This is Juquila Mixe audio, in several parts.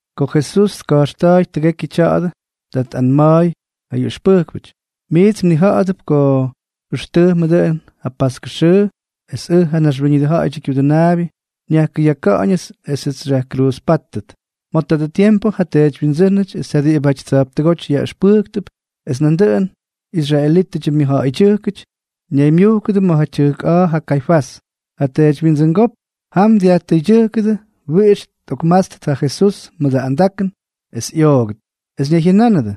Ko Jesús tka̱jxta̱a̱y tʉgekyʉ tya̱a̱dʉ, ta tꞌanma̱a̱y ja ꞌyʉxpʉjkpʉty: —Miits mnija̱ꞌa̱dʉp ko jʉxtʉjmʉ dʉꞌʉn ja paskʉ xʉʉ, es ʉj, ja Naxwíñʉdʉ Ja̱ꞌa̱yʉdyʉ Kyudʉnaabyʉ, nyajkʉyaka̱ꞌa̱ñʉts esʉts xyajkruuzpátʉt. Ma̱ tadʉ tiempʉ ja teedywyindsʉ́nʉty es ja diꞌibʉty tsa̱jptʉgóty yaꞌʉxpʉjktʉp es nandʉꞌʉnʉ israelítʉdyʉ myʉjja̱ꞌa̱ydyʉjkʉty ñaymyujkʉdʉ ma̱ tyʉjk a̱a̱ Kaifás, ja teedywyindsʉngópk. Jam dyajtʉydyʉjkʉdʉ wiꞌix tꞌokmátstʉt ja Jesús mʉdʉ andakʉn, es ꞌyoogʉt. Es ñayjyʉnánʉdʉ: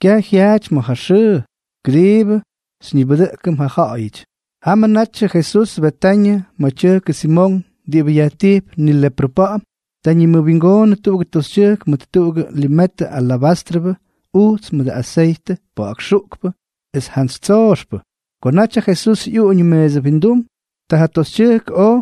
—Kyaj jyaaty ma̱ ja xʉʉ, kʉdiibʉ xyñibʉdʉꞌkʉm ja ja̱ꞌa̱yʉty. Jamʉ natyʉ Jesús Betañʉ ma̱ tyʉjkʉ Simonk diꞌibʉ yajtijp nileprʉ pa̱ꞌa̱m. Ta ñimʉwingoonʉ tuꞌugʉ toxytyʉjk mʉt tuꞌugʉ limetʉ alabástrʉbʉ ujts mʉdʉ aseytʉ pa̱ꞌa̱k xuꞌkpʉ es jantsy tsooxpʉ. Ko naty ja Jesús ꞌyuꞌuñʉ meesʉ windum, ta ja toxytyʉjk oj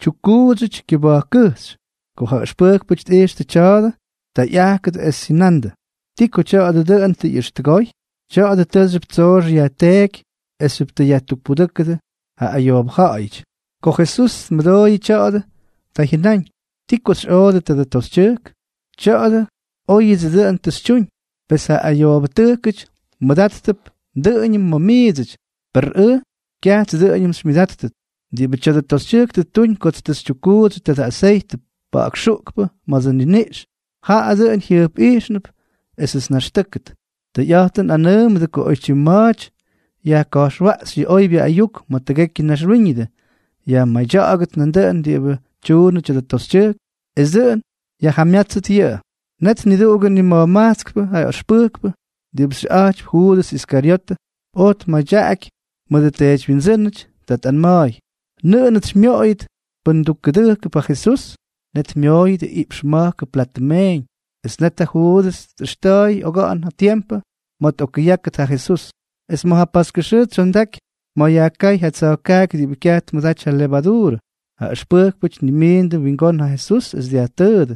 tyukkuudsʉty kyʉba̱jkkʉjxy. Ko ja ʉxpʉjkpʉty tꞌijxtʉ tya̱a̱dʉ, ta ꞌyajkʉdʉ es jyʉnandʉ: —¿Ti ko tya̱a̱dʉ dʉꞌʉn tʉ ꞌyʉxtʉgoy? Tya̱a̱dʉ tʉʉxyʉp tsoox yajteeky esxyʉp tʉ yajtukpudʉ́kʉdʉ ja ayoobʉ ja̱ꞌa̱yʉty. Ko Jesús tmʉdooyʉ tya̱a̱dʉ, ta jyʉnáñ: —¿Ti ko xyꞌoodʉ tadʉ toxytyʉjk? Tya̱a̱dʉ óyʉdsʉ dʉꞌʉn tʉ xytyuñ. Pes ja ayoobʉtʉjkʉty mmʉdáttʉp dʉꞌʉñʉm ma̱ miidsʉty, per ʉj kyajts dʉꞌʉñʉm xymyʉdáttʉt. Diꞌibʉ tya̱dʉ toxytyʉjk tʉ ttuñ kots tʉ xytyukkuudsyʉ tadʉ aseytʉ pa̱ꞌa̱k xuꞌkpʉ ma̱dsʉ nniniꞌx, jaꞌa dʉꞌʉn jyʉjpꞌijxnʉp esʉts nnaxtʉ́kʉt. Tʉyꞌa̱jtʉn nꞌanʉʉmʉdʉ ko oytyim ma̱a̱ty yajka̱jxwaꞌxy yʉ oybyʉ ayuk ma̱ tʉgekyʉ naxwíñʉdʉ, yajmadya̱ꞌa̱gʉt nandʉꞌʉn diꞌibʉ tyuunʉ tya̱dʉ toxytyʉjk, es dʉꞌʉn yajjamyátsʉt yʉꞌʉ. Net niduꞌugʉ nima̱jmajtskpʉ ja ʉxpʉjkpʉ diꞌibʉ xyʉꞌa̱jtypy Juudʉs Iskaryotʉ, oj myadyaꞌaky mʉdʉ teedywyindsʉ́nʉty. Ta tꞌanma̱a̱y: —¿Nʉꞌʉnʉts xymyoꞌoyʉt pʉn ndukkʉdʉjkʉdʉp ja Jesús? Net myooyʉdʉ iꞌpx ma̱jkʉ platʉ meeñ. Es net ja Juudʉs tꞌʉxta̱a̱y oga̱ꞌa̱n ja tiempʉ ma̱ tꞌokkʉyákʉt ja Jesús. Es ma̱ ja paskʉ xʉʉ tsyondaky ma̱ yajkáy ja tsa̱jkaaky diꞌibʉ kyaj tmʉdaty ja levaduurʉ, ja ʉxpʉjkpʉty tnimiindʉ wingón ja Jesús es dyajtʉʉdʉ: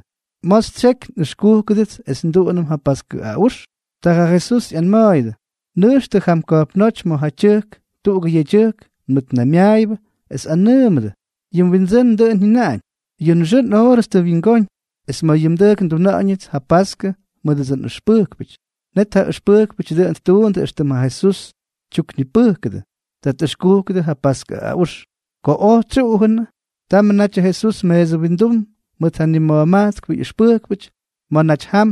—¿Ma̱a̱ xytsyeky nꞌʉxkúkʉdʉts es nduꞌunʉm ja paskʉ aꞌux? Ta ja Jesús ꞌyanma̱a̱yʉdʉ: —Nʉjxtʉ jam ka̱jpnóty ma̱ ja tyʉjk tuꞌugʉ yedyʉjk nmʉtnaymyaayʉbʉ, es anʉʉmʉdʉ: “Yʉ Windsʉ́n dʉꞌʉn jyʉnaꞌañ: Yʉ nxʉʉ nꞌoorʉts tʉ wyingóñ, es ma̱ yʉ mdʉjk nduna̱ꞌa̱ñʉts ja paskʉ mʉdʉdsʉ nꞌʉxpʉjkpʉty.” Net ja ʉxpʉjkpʉty dʉꞌʉn ttuundʉ éxtʉm ja Jesús tyuknipʉjkʉdʉ. Ta tꞌʉxkujkʉdʉ ja paskʉ aꞌux. Ko oj tsyuꞌujʉnʉ, tamʉ natyʉ Jesús meesʉ windum mʉt ja nima̱jmajtskpʉ ꞌyʉxpʉjkpʉty. Ma̱ naty jam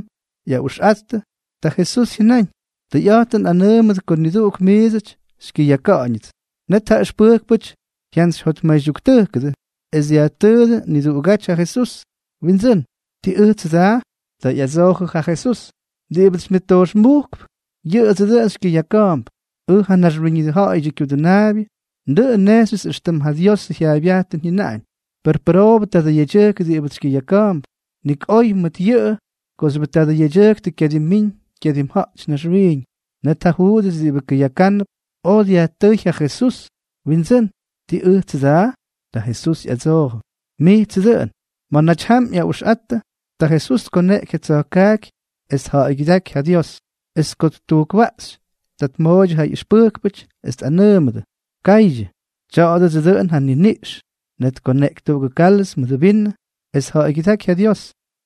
ꞌyaꞌuxꞌattʉ, ta Jesús jyʉnáñ: —Tʉyꞌa̱jtʉn nꞌanʉʉmʉdʉ ko niduꞌuk miidsʉty xykyʉyaka̱ꞌa̱ñʉts. Net ja ʉxpʉjkpʉty jyantsyjyotmaydyuktʉjkʉdʉ, es dyajtʉʉdʉ niduꞌugáty ja Jesús: —Windsʉ́n, ¿tii ʉjtsʉ daa? Ta ꞌyadsoojʉ ja Jesús: —Diꞌibʉts xymyʉttojxmujkp, yʉꞌʉdsʉ dʉꞌʉn xykyʉyaka̱a̱mp. Ʉj ja Naxwíñʉdʉ Ja̱ꞌa̱yʉdyʉ Kyudʉnaabyʉ, dʉꞌʉn nnejxyʉts éxtʉm ja Diosʉ jyaaybyajtʉn jyʉnaꞌañ. ¡Per pʉroobʉ tadʉ yedyʉjk diꞌibʉts xykyʉyaka̱a̱mp! Nik oy mʉt yʉꞌʉ kooxyʉbʉ tadʉ yedyʉjk kyadimmiiñ kyadimja̱jty naxwiiñ. Net ja Juudʉs diꞌibʉ kʉyakánʉp, oj dyajtʉʉy ja Jesús: —Windsʉ́n, ¿tii ʉjtsʉ daa? Ta Jesús ꞌyadsoojʉ: —Mijtsʉ dʉꞌʉn. Ma̱ naty jam ꞌyaꞌuxꞌattʉ, ta Jesús tkoneꞌky ja tsa̱jkaaky, es tja̱ꞌa̱ygyʉdáky ja Dios. Es ko ttujkwaꞌxy, ta tmooydyʉ ja ꞌyʉxpʉjkpʉty, es tꞌanʉʉmʉdʉ: —Kaydyʉ. Tya̱a̱dʉdsʉ dʉꞌʉn ja nniniꞌx. Net tkoneꞌky tuꞌugʉ kálʉz mʉdʉ vinʉ, es tja̱ꞌa̱ygyʉdáky ja Dios.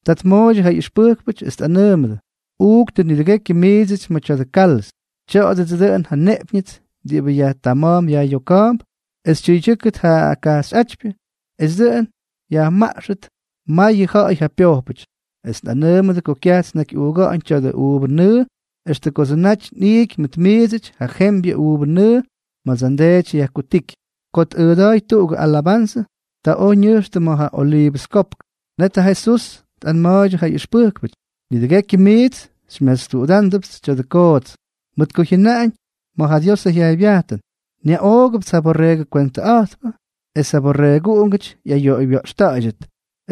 Ta tmooydyʉ ja ꞌyʉxpʉjkpʉty, es tꞌanʉʉmʉdʉ: —Uuktʉ nidʉgekyʉ miidsʉty ma̱ tya̱dʉ kálʉz. Tya̱a̱dʉdsʉ dʉꞌʉn ja nneꞌpyñʉts diꞌibʉ yajtama̱a̱mp yajꞌyoka̱a̱mp es tyʉydyʉ́kʉt ja kajxyꞌátypyʉ, es dʉꞌʉn yajmaꞌxʉt mayʉ ja̱ꞌa̱y ja pyojpʉty. Es nꞌanʉʉmʉdʉ ko kyajts nnakyꞌuuga̱ꞌa̱ñʉ tya̱dʉ uuvʉ nʉʉ extʉ kodsʉ naty nꞌiiky mʉt miidsʉty ja jembyʉ uuvʉ nʉʉ ma̱dsʉ nDeedyʉts yajkutíky. Ko tꞌʉʉda̱a̱y tuꞌugʉ alabanzʉ, ta oj ñʉjxtʉ ma̱ ja Oliivʉs Kopk. Net ja Jesús tꞌanma̱a̱ydyʉ ja ꞌyʉxpʉjkpʉty: —Nidʉgekyʉ miits xymyatstuꞌudándʉpts tya̱a̱dʉ koots, mʉt ko jyʉnaꞌañ ma̱ Diosʉ jyaaybyajtʉn: “Nyaꞌoogʉpts ja borreegʉ kwentʉꞌa̱jtpʉ, es ja byorreegʉty ꞌyayoꞌoywya̱ꞌxta̱ꞌa̱ydyʉt.”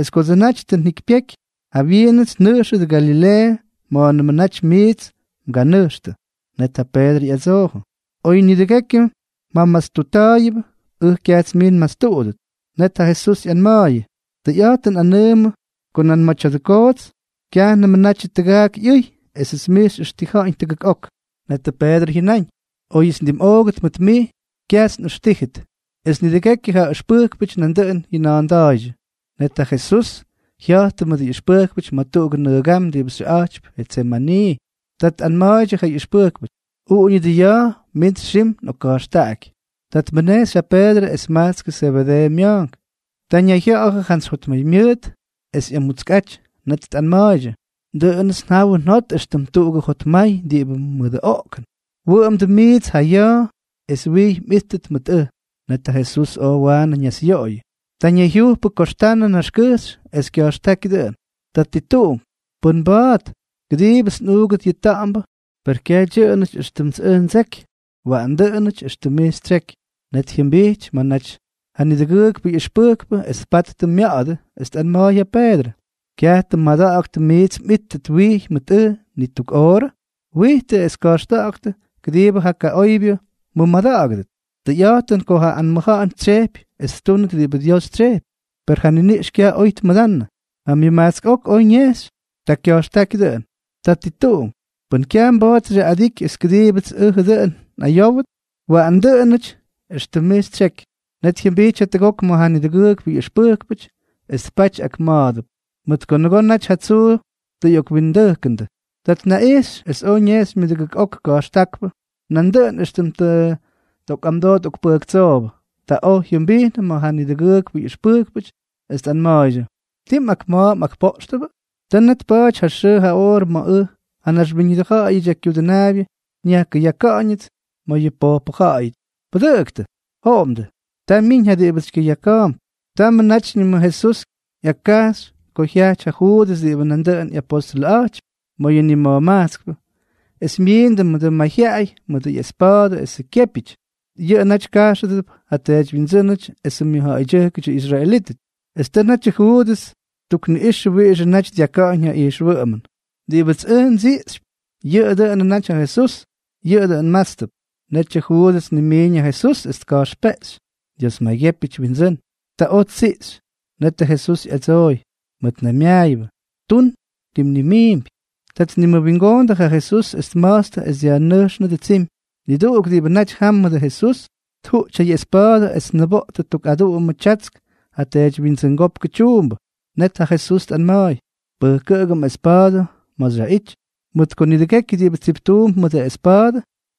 Es kodsʉ naty tʉ njikypyeky, jawyiinʉts nnʉjxʉt Galileeʉ ma̱a̱nʉmʉ naty miits mganʉjxtʉ. Net ja Peedrʉ ꞌyadsoojʉ: —Oy nidʉgekyʉ mjamatstutta̱a̱yʉbʉ, ʉj kyajts mij nmatstuꞌudʉt. Net ja Jesús ꞌyanma̱a̱yʉ: —Tʉyꞌa̱jtʉn nꞌanʉʉmʉ ko nan ma̱ tya̱dʉ koots, kyajnʉmʉ natyʉ tʉgaak ꞌyʉy, esʉts mij xyꞌʉxtija̱ꞌa̱ñ tʉgʉk ok. Netʉ Peedrʉ jyʉnáñ: —Oyʉts ndimꞌoogʉt mʉt mij, kyaj nꞌʉxtíjʉt. Es nidʉgekyʉ ja ʉxpʉjkpʉty nandʉꞌʉn jyʉna̱a̱nda̱a̱ydyʉ. Net ja Jesús jya̱jttʉ mʉdʉ ꞌyʉxpʉjkpʉty ma̱ tuꞌugʉ nʉgam diꞌibʉ xyʉꞌa̱jtypy Jetsemanii. Ta tꞌanma̱a̱ydyʉ ja ꞌyʉxpʉjkpʉty: —Uꞌuñʉdʉ ya̱a̱ mints xim nꞌokka̱jxtaꞌaky. Ta tmʉnejxy ja Peedrʉ es majtskʉ Zebedeeʉ mya̱a̱nk. Ta ñayjya̱ꞌa̱jʉ jantsy jotmaymyʉʉt es ꞌyamutskꞌa̱jty. Net tꞌanma̱a̱ydyʉ: —Dʉꞌʉnʉts njawʉ njodoty éxtʉm tuꞌugʉ jotmay diꞌibʉ mʉdʉ oꞌkʉn. Wʉꞌʉmdʉ miits ja ya̱a̱ es wijy mꞌíttʉt mʉt ʉj. Net ja Jesús oj waanʉ ñasꞌyoꞌoyʉ. Ta ñayjyujpʉ koxtanʉ naxkʉjxy, es kya̱jxtáky dʉꞌʉn: —Tatituꞌunk, pʉn mba̱a̱t, kʉdiibʉts nꞌuugʉt yʉ ta̱ꞌa̱mbʉ. Per kyaj dyʉꞌʉnʉty éxtʉmts ʉj ndseky, waꞌanʉ dʉꞌʉnʉty éxtʉm mij xytsyeky. Net jyʉmbijty ma̱ naty ja nidʉgʉʉkpʉ ꞌyʉxpʉjkpʉ es tpattʉ mya̱ꞌa̱dʉ, es tꞌanma̱a̱y ja Peedrʉ: —¿Kyaj tʉ mmada̱ꞌa̱ktʉ miits mꞌíttʉt wijy mʉt ʉj ni tuk oorʉ? Wijtʉ es ka̱jxta̱ꞌa̱ktʉ kʉdiibʉ ja kaꞌoybyʉ mmʉmada̱ꞌa̱gʉdʉt. Tʉyꞌa̱jtʉn ko ja anmʉja̱ꞌa̱n tsyejpy es ttúnʉt diꞌibʉ Dios tsyejpy, per yʉ niniꞌx kyaj oy tmʉdanʉ. Ja myʉmajtsk ok oj ñejxy, ta kya̱jxtáky dʉꞌʉn: —Tatituꞌunk, pʉn kyaj mba̱a̱t xyaꞌꞌadiky es kʉdiibʉts ʉjʉ dʉꞌʉn nꞌayówʉt, waꞌanʉ dʉꞌʉn dʉꞌʉnʉty éxtʉm mij xytsyeky. Net jyʉmbijty jatʉgok ma̱ ja nidʉgʉʉkpʉ ꞌyʉxpʉjkpʉty, es tpaty ak ma̱a̱dʉp, mʉt ko nʉgoo naty ja tsuu tʉ ꞌyokwindʉjkʉndʉ. Ta tnaꞌijxy es oj ñejxy myʉdʉgʉk ok ka̱jxtákpʉ, nandʉꞌʉn éxtʉm tʉ tꞌokꞌamdoo tꞌokpʉjktsoobʉ. Ta oj jyʉmbijnʉ ma̱ ja nidʉgʉʉkpʉ ꞌyʉxpʉjkpʉty, es tꞌanma̱a̱ydyʉ: —¿Tii mꞌakma̱a̱ mꞌakpoꞌxtʉbʉ? Tʉ net tpa̱a̱ty ja xʉʉ ja oorʉ ma̱ ʉj, ja Naxwíñʉdʉ Ja̱ꞌa̱yʉdyʉ Kyudʉnaabyʉ, nyajkʉyaka̱ꞌa̱ñʉts ma̱ yʉ pojpʉ ja̱ꞌa̱yʉty. ¡Pʉdʉꞌʉktʉ! ¡Joꞌomdʉ! Ta myiñ ja diꞌibʉts xykyʉyaka̱a̱mp. Tamʉ natyñʉmʉ Jesús ꞌyakkajxy ko jyajty ja Juudʉs diꞌibʉ nandʉꞌʉn ꞌyapóstʉlʉꞌa̱jtypy ma̱ yʉ nima̱jmajtskpʉ, es myindʉ mʉdʉ mayjyaꞌay mʉdʉ ꞌyespa̱a̱dʉ esʉ kyépyʉty. Yʉꞌʉ naty kajxʉdʉp ja teedywyindsʉ́nʉty esʉ myʉjja̱ꞌa̱ydyʉjkʉdyʉ israelítʉty. Es tʉ natyʉ Juudʉs ttukniꞌꞌixʉ wiꞌixʉ naty dyaka̱ꞌa̱ñ ja ijxwʉꞌʉmʉn: —Diꞌibʉts ʉj ndsiꞌxypy, yʉꞌʉ dʉꞌʉnʉ naty ja Jesús. Yʉꞌʉ dʉꞌʉn mmátstʉp. Netyʉ Juudʉs tnimiiñ ja Jesús, es tka̱jxpeꞌxy: —Dios maygyépyʉty, Windsʉ́n. Ta oj ttsiꞌxy. Netʉ Jesús ꞌyadsooy: —Mʉtnaymyaaybyʉ, ¿tun ti mnimiimpy? Ta tnimʉwingoondʉ ja Jesús es tma̱jtstʉ es dyajnʉjxnʉdʉ tsimy. Niduꞌuk diꞌibʉ naty jam mʉdʉ Jesús, tjuꞌty ja ꞌyespa̱a̱dʉ es tniboꞌtʉ tuk aduꞌumʉ tyatsk ja teedywyindsʉngópkʉ tyuumbʉ. Net ja Jesús tꞌanma̱a̱y: —Pʉjkʉꞌʉgʉ mꞌespa̱a̱dʉ ma̱ xyaꞌity. Mʉt ko nidʉgekyʉ diꞌibʉ tsiptuump mʉdʉ espa̱a̱dʉ,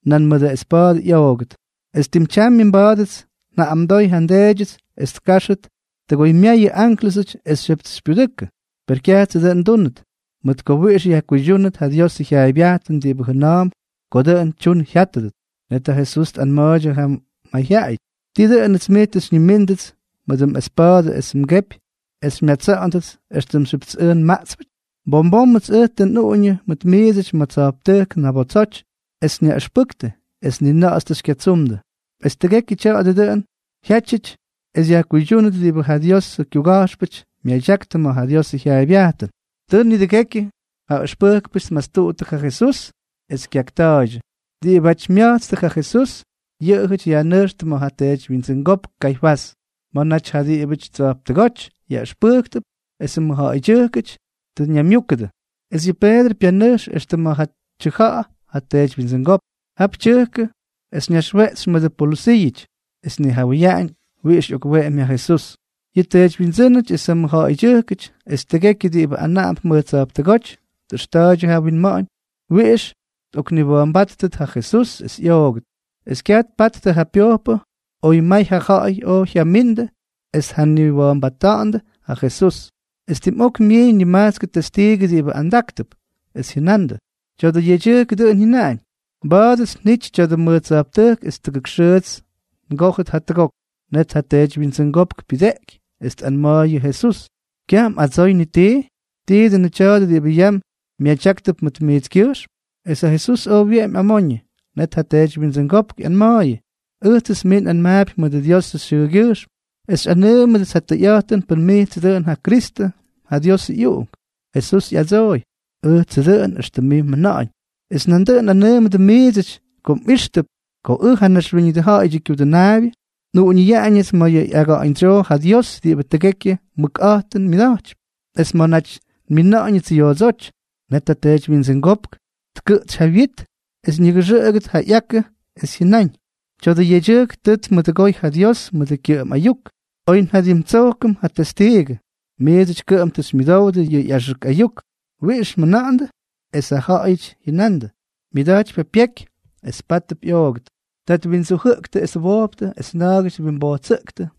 nan mʉdʉ espa̱a̱dʉ ꞌyoogʉt. Es tim tyamyʉ mba̱a̱dʉts njaꞌꞌamdoy ja nDeedyʉts es tkáxʉt tʉgoymyayʉ ánklʉsʉty esxyʉpts xypyudʉkʉ. Per kyajtsʉ dʉꞌʉn ndúnʉt, mʉt ko wiꞌix yajkuydyúnʉt ja Diosʉ jyaaybyajtʉn diꞌibʉ jʉna̱a̱mp ko dʉꞌʉn tyun jyátʉt. Net ja Jesús tꞌanma̱a̱ydyʉ ja mayjyaꞌayʉty: —¿Tii dʉꞌʉnʉts miits tʉ xyñimíndʉts mʉdʉ mꞌespa̱a̱dʉ esʉ mgepy es xymyatsa̱ꞌa̱ndʉts éxtʉmxyʉpts ʉj nmaꞌtspʉty? Bom bómʉts ʉj tʉ nꞌuꞌuñʉ mʉt miidsʉty mʉj tsa̱jptʉjk ñabotsoty es nyaꞌʉxpʉktʉ, es ni na̱ꞌa̱ts tʉ xykyatsumdʉ. Es tʉgekyʉ tya̱a̱dʉ dʉꞌʉn játyʉty es yajkuydyúnʉt diꞌibʉ ja Diosʉ kyuga̱jxpʉty myadyaktʉ ma̱ ja Diosʉ jyaaybyajtʉn. Ta nidʉgekyʉ ja ʉxpʉjkpʉty tmastuttʉ ja Jesús, es kyakta̱a̱ydyʉ. Diꞌibáty mya̱jtstʉ ja Jesús, yʉꞌʉjʉty yajnʉjxtʉ ma̱ ja teedywyindsʉngópk Kaifás, ma̱ naty ja diꞌibʉty tsa̱jptʉgóty yaꞌʉxpʉjktʉp esʉ mʉjja̱ꞌa̱ydyʉjkʉty tʉ ñaymyúkʉdʉ. Es yʉ Peedrʉ pyanʉjx extʉ ma̱ ja tyʉja̱ꞌa̱ ja teedywyindsʉngópk. Jap tyʉjkʉ es ñaxweꞌtsy mʉdʉ polʉsiiʉty, es tnijawʉyaꞌañ wiꞌix ꞌyokweꞌemy ja Jesús. Yʉ teedywyindsʉ́nʉty es ja mʉjja̱ꞌa̱ydyʉjkʉty es tʉgekyʉ diꞌibʉ anaꞌamdʉp mʉj tsa̱jptʉgóty tꞌʉxta̱ꞌa̱ydyʉ ja winma̱ꞌa̱ñ wiꞌix tꞌokniwa̱a̱mbáttʉt ja Jesús es ꞌyoogʉt, es kyaj tpattʉ ja pyojpʉ oy may ja ja̱ꞌa̱y oj jyamindʉ es tjaniwa̱a̱mbajttʉ ja Jesús. Es tim ok myiiñ nimajtskʉ testiigʉ diꞌibʉ andáktʉp, es jyʉnandʉ: —Tya̱a̱dʉ yedyʉjk dʉꞌʉn jyʉnaꞌañ: “Mba̱a̱dʉts njity tya̱dʉ mʉj tsa̱jptʉjk es tʉgʉk xʉʉts ngójʉt jatʉgok.” Net ja teedywyindsʉngópk pyʉdeꞌky es tꞌanma̱a̱y yʉ Jesús: —¿Kyaj mꞌadsoy ni tii? ¿Tii dʉnʉ tya̱a̱dʉ diꞌibʉ yam myadyáktʉp mʉt mijtskyʉjxm? Es ja Jesús oj wyeꞌemy amoñʉ. Net ja teedywyindsʉngópk ꞌyanma̱a̱yʉ: —Ʉjtsʉts mij nꞌanmaapy mʉdʉ Diosʉ xyʉʉgyʉjxm es xyꞌanʉʉmʉdʉts ja tʉyꞌa̱jtʉn pʉn mijtsʉ dʉꞌʉn ja Kristʉ, ja Diosʉ ꞌyUꞌunk. Jesús ꞌyadsooy: —Ʉjtsʉ dʉꞌʉn éxtʉm mij mjʉna̱ꞌa̱ñ, es nandʉꞌʉn nꞌanʉʉmʉdʉ miidsʉty ko mꞌíxtʉp ko ʉj, ja Naxwíñʉdʉ Ja̱ꞌa̱yʉdyʉ Kyudʉnaabyʉ, nꞌuꞌuñʉyaꞌañʉts ma̱ yʉ ꞌyaga̱ꞌa̱ñdsyoo ja Dios diꞌibʉ tʉgekyʉ mʉkꞌa̱jtʉn myʉda̱jtypy, es ma̱ naty nmina̱ꞌa̱ñʉts yoodsóty. Net ja teedywyindsʉngópk tkʉꞌtsy ja wyit es ñʉgʉxʉꞌʉgʉt ja ꞌyakʉ, es jyʉnáñ: —¡Tya̱dʉ yedyʉjk tʉ tmʉdʉgoy ja Dios mʉdʉ kyʉꞌʉm ayuk! ¿Oy njadimtsojkʉm ja testiigʉ? Miidsʉty kʉꞌʉm tʉ xymyʉdowdʉ yʉ ꞌyaxʉk ayuk. ¿Wiꞌix mjʉna̱ꞌa̱ndʉ? Es jaꞌajʉty jyʉnandʉ: —Myʉda̱jtypy ja pyeky, es pátʉp ꞌyoogʉt. Ta twindsujʉꞌktʉ es twojptʉ es na̱a̱gʉty twimbojtsʉꞌktʉ,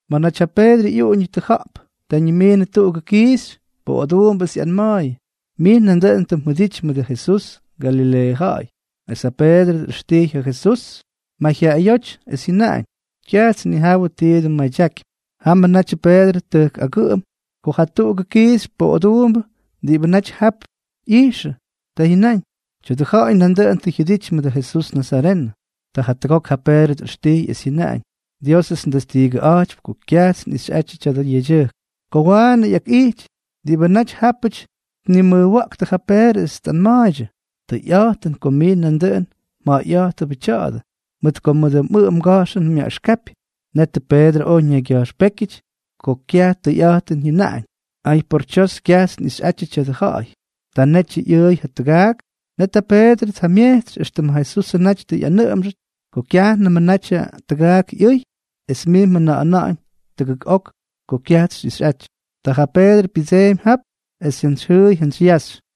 Ma̱ naty ja Peedrʉ ꞌyuꞌuñʉ tʉja̱ꞌp, ta ñimiinʉ tuꞌugʉ kiixy poꞌoduumbʉ es ꞌyanma̱a̱yʉ: —Mij nandʉꞌʉn tʉ mjʉdity mʉdʉ Jesús, Galileeʉ ja̱ꞌa̱y. Es ja Peedrʉ ꞌyʉxtijy ja Jesús mayjyaꞌayóty, es jyʉnaꞌañ: —Kyajts nnijawʉ ti dʉn mmadyakypy. Jamʉ natyʉ Peedrʉ tʉjk agʉꞌʉm ko jatuꞌugʉ kiixy poꞌoduumbʉ diꞌibʉ naty jap ꞌyijxʉ. Ta jyʉnáñ: —Tya̱dʉ ja̱ꞌa̱y nandʉꞌʉn tʉ jyʉdity mʉdʉ Jesús nazarenʉ. Ta jatʉgok ja Peedrʉ tꞌʉxtijy, es jyʉnáñ: —Diósʉts ndestiigʉꞌa̱jtypy ko kyajts nꞌixyꞌatyʉ tadʉ yedyʉjk. Ko waanʉ ꞌyakꞌijty, diꞌibʉ naty jápʉty tnimʉjwa̱ꞌktʉ ja Peedrʉ es tꞌanma̱a̱ydyʉ: —Tʉyꞌa̱jtʉn ko mij nandʉꞌʉn mja̱ꞌa̱yꞌa̱jtʉbʉ tya̱a̱dʉ, mʉt ko mʉdʉ mꞌʉꞌʉ mga̱jxʉn myaꞌʉxkapy. Netʉ Peedrʉ oj ñaygya̱jxpékyʉty ko kyaj tʉyꞌa̱jtʉn jyʉnaꞌañ: —¡Ay, por tsyos! Kyajts nꞌixyꞌatyʉ tadʉ ja̱ꞌa̱y. Ta netyʉ ꞌyʉʉy ja tʉgaak. Net ja Peedrʉ tjamyejtsy éxtʉm ja Jesusʉ naty tʉ ꞌyanʉꞌʉmxʉty: “Ko kyajnʉmʉ natyʉ tʉgaak ꞌyʉy, es mij mjʉna̱ꞌa̱na̱ꞌa̱ñ tʉgʉk ok ko kyajts xyꞌixꞌaty.” Taa ja Peedrʉ pyʉdseemy jap, es jantsy jyʉʉy yaxy.